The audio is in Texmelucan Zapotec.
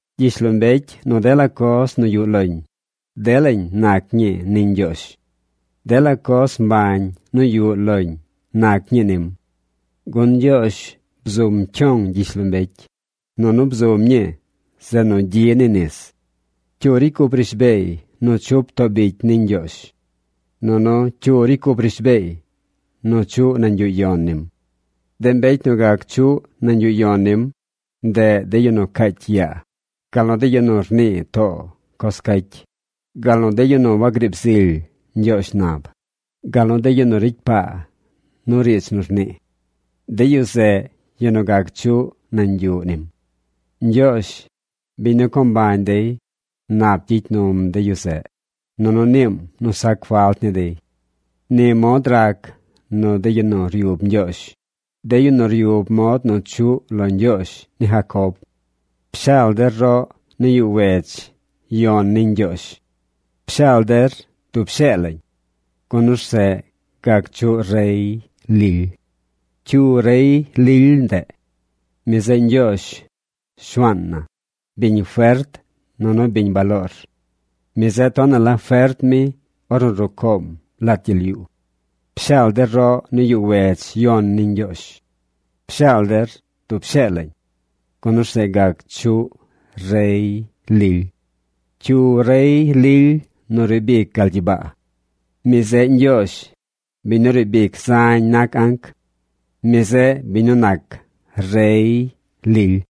Gyishlombecy nu dela coz nu yuꞌ loñ, delañ nac ñii ni Ñgyoozh. Dela coz mbañ nu yuꞌ loñ nac ñii nim. Gun Ñgyoozh bzum cyong gyishlombecy, nunu bzum ñii zeꞌ nu gyi ni nis. ¿Cyu ricy cup rishbeey nu chup too bicy ni Ñgyoozh? Nunu, ¿cyu ricy cup rishbeey nu chuꞌ nañ yuꞌ yon nim? De mbecy nu gac chuꞌ nañ yuꞌ yon nim, ndeꞌ de yu nu caacy yaa, gal nu de yu nu rnii too coz caacy, gal nu de yu nu wagriib zily ñgyoozh nab, gal nu de yu nu ricy paa nu riidz nu nii. De yu zeꞌ yu nu gac chuꞌ nañ yuꞌ nim. Ñgyoozh, biñ nu co mbañ dey, nap gyicy num de yu zeꞌ, nunu niim nu sac falt ni dey. Ni mod rac nu de yu nu ryub Ñgyoozh, de yu nu ryub mod nu chuꞌ lo Ñgyoozh ni Jacob. ¡Pshaal der roꞌ ni yuꞌ wedz yon ni Ñgyoozh! ¡Pshaal der dub shee lañ! Gun orzeꞌ gac chuꞌ rey lily. ¿Cyu rey lily ndeꞌ? Mi zeꞌ Ñgyoozh, Shuaan na, biñ fert nunu biñ baloor. Mi zeꞌ tonaꞌ la fert mi ornu rucoom lat gyel yuu. ¡Pshaal der roꞌ ni yuꞌ wedz yon ni Ñgyoozh! ¡Pshaal der dub shee lañ! Gun orzeꞌ gac chuꞌ rey lily. ¿Cyu rey lily nu riib ic gal gyibaa? ¡Mi zeꞌ Ñgyoozh, biñ nu riib ic zañ nac anc! ¡Mi zeꞌ biñ nu nac rey lily!